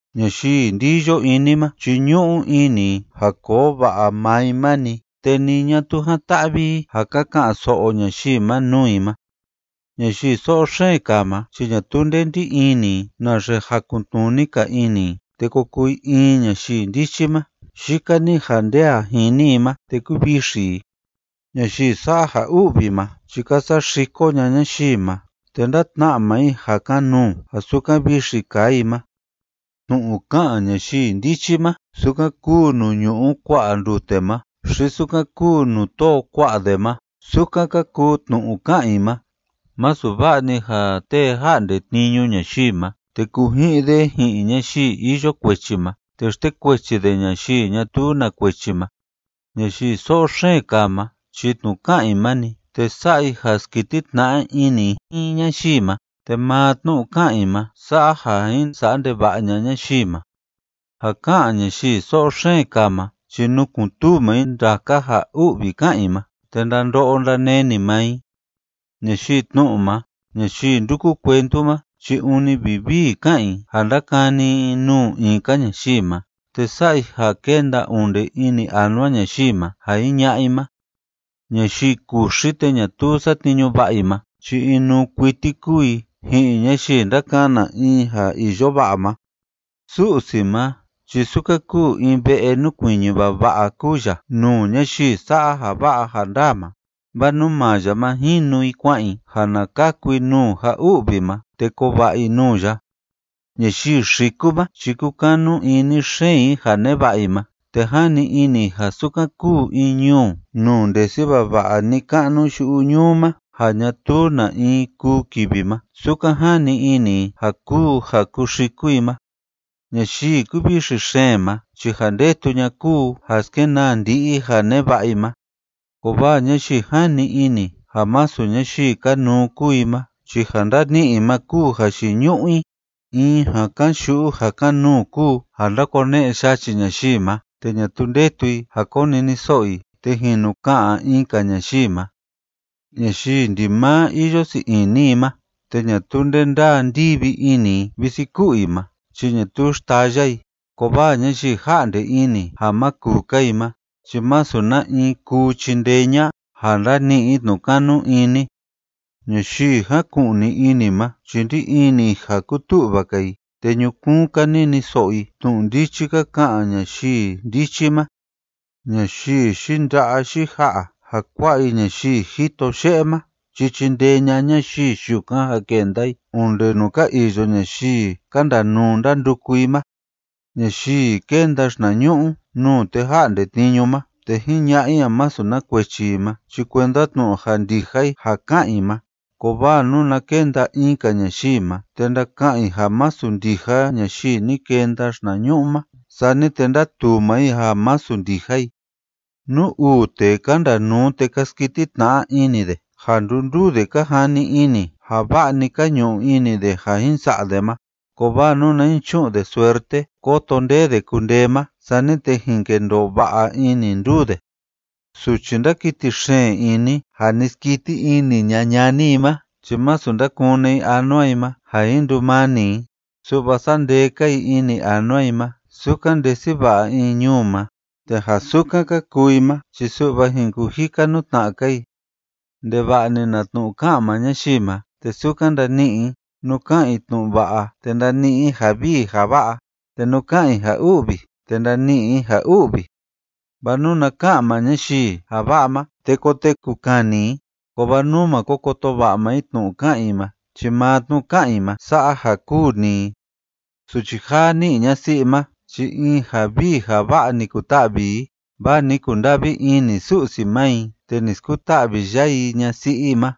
Ñayii ndiyo ini ma chi ñu'u ini i ja koo va'a maa i ma‑ni, te ni ñatuu jan‑ta'vi i ja ka ka'an‑so'o ñayii ma nuu i ma. Ñayii so'o xeen kaa ma chi ñatuu nde ndí ini i naxe jakun‑tnuni‑ka ini i te ko kuu i in ñayii ndichi ma, yika‑ni ja nde a jini i ma te kúvixi i. Ñayii sa'a ja u'vi ma chi ka saxiko ña'a ñayii ma, te ndátna'a maa i ja kan‑nuu ja sukan vixi kaa i ma. Tnu'u ká'an ñayii ndichi ma, sukan kúu nuu ñu'u kua'a ndute ma xi sukan kúu nuu tóo kua'a de ma, sukan ka kuu tnu'u ká'an i ma. Masu va'a‑ni ja tee ja'nde tniñu ñayii ma, te kuji'in de ji'in ñayii iyo kuechi ma, te xtekuechi de ñayii ñatuu na kuechi ma. Ñayii so'o xeen kaa ma chi tnu'u ká'an i ma‑ni, te sa'a i ja skiti tna'a ini i ji'in ñayii ma, te maa tnu'u ká'an i ma sa'a ja jin sa'a ndeva'a ña'a ñayii ma. Ja ká'an ñayii so'o xeen kaa ma chi nukun‑tuu maa i ndaka ja u'vi ká'an i ma, te ndando'o ndaneni maa i. Ñayii tnu'u ma, ñayii ndúku cuentu ma chi ûni vivii ká'an i ja ndákani i nuu in‑ka ñayii ma, te sa'a i ja kénda onde ini anua ñayii ma ja jiña'a i ma. Ñayii kuxi te ñatuu satniñu va'a i ma chi inuu kuiti kúu i ji'in ñayii ndákana in ja iyo va'a ma. Su'si ma chi sukan kúu in ve'e núkuiñi vava'a kúu ya nuu ñayii sa'a ja va'a ja ndaa ma, vaa nuu maa ya ma jinu i kua'an i, ja na kaku i nuu ja u'vi ma te koo va'a i nuu ya. Ñayii xiku ma chi kúkanu ini xeen i ja neva'a i ma, te jani ini i ja sukan kúu in ñuu nuu ndesi vava'a ni‑ka'nu yu'u ñuu ma ja ñatuu na in kuu kivi ma, sukan jani ini i ja kúu ja kúxiku i ma. Ñayii kúvixi xeen ma chi ja ndetu ña'a kúu ja skenaa ndi'i i ja neva'a i ma, kovaa ñayii jani ini ja masu ñayii kanuu kúu i ma chi ja ndani'i i ma kúu jayiñu'u i. In ja kan‑yu'u ja kan‑nuu kúu ja ndákone'e yachi ñayii ma te ñatuu ndetu i ja koniniso'o i te jinu ka'an in‑ka ñayii ma. Ñayii ndimaa iyo sii ini i ma te ñatuu nde ndaa ndivi ini i visi ku'u i ma chi ñatuu xtaya i, kovaa ñayii ja'nde ini ja ma kuu‑ka i ma chi masu na‑in kuu chindee ña'a ja ndani'i i tnu'u kanu ini. Ñayii jáku'ni ini ma chi ndí ini i ja kutu'va‑ka i, te ñukuun‑ka niniso'o i tnu'u ndichi ka ka'an ñayii ndichi ma. Ñayii yinda'a yija'a ja kua'a i ñayii jito ye'e ma chi chindee ña'a ñayii yukan ja kenda i onde nuu ka iyo ñayii ka ndanuu ndánduku i ma. Ñayii kénda xinañu'u nuu tee ja'nde tniñu ma te jiña'a i ja masu na kuechi i ma chi kuenda tnu'u ja ndija i ja ká'an i ma, kovaa nuna kenda in‑ka ñayii ma te ndaka'an i ja masu ndija ñayii ni kenda xinañu'u ma, sani te ndatuu ndaa maa i ja masu ndija i. Nú uu tee ka ndanuu te ka skiti tna'a ini de ja ndunduu de ka jani ini ja va'a‑ni ka ñu'u ini de ja jin sa'a de ma, kovaa nuna jin chu'un de suerte kóto nde de kundee ma, sani te jin kendoo va'a ini nduu de. Suchi ndákiti xeen ini ja ni skiti ña'a ini ñani i ma chi masu ndakune i anua i ma ja jin ndumani i, su'va sa'a ndee‑ka i ini anua i ma sukan ndesi va'a in ñuu ma, te ja sukan ka kuu i ma chi su'va jin kujika nuu tna'a‑ka i. Ndeva'a‑ni na tnu'u ká'an maa ñayii ma te sukan ndani'i i, nú ká'an i tnu'u va'a te ndani'i i ja vii ja va'a, te nú ká'an i ja u'vi te ndani'i i ja u'vi. Vaa nuna ka'an maa ñayii ja va'a ma te koteku kani i, kovaa nú ma ko koto va'a maa i tnu'u ká'an i ma chi maa tnu'u ká'an i ma sa'a ja kûu‑ni i. Suchi jaa ní'i ñasi'i ma chi in ja vii ja va'a ni kuta'vi i, vaa ni kunda'vi ini Su'si ma i, te ni skuta'vi ya i ñasi'i i ma.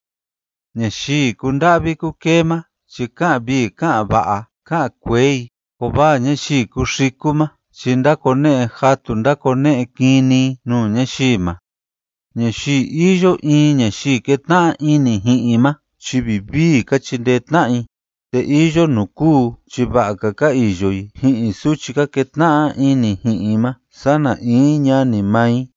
Ñayii kúnda'vi kúkee ma chi ká'an vii ká'an va'a ká'an kuee i, kovaa ñayii kúxiku ma chi ndákone'e jatu ndákone'e kini i nuu ñayii ma. Ñayii iyo in ñayii kétna'a ini ji'in i ma chi vivii ka chindee tna'a i, te iyo nuu kúu chi va'a‑ka ka iyo i ji'in suchi ka ketna'a ini ji'in i ma sana in ñani maa i.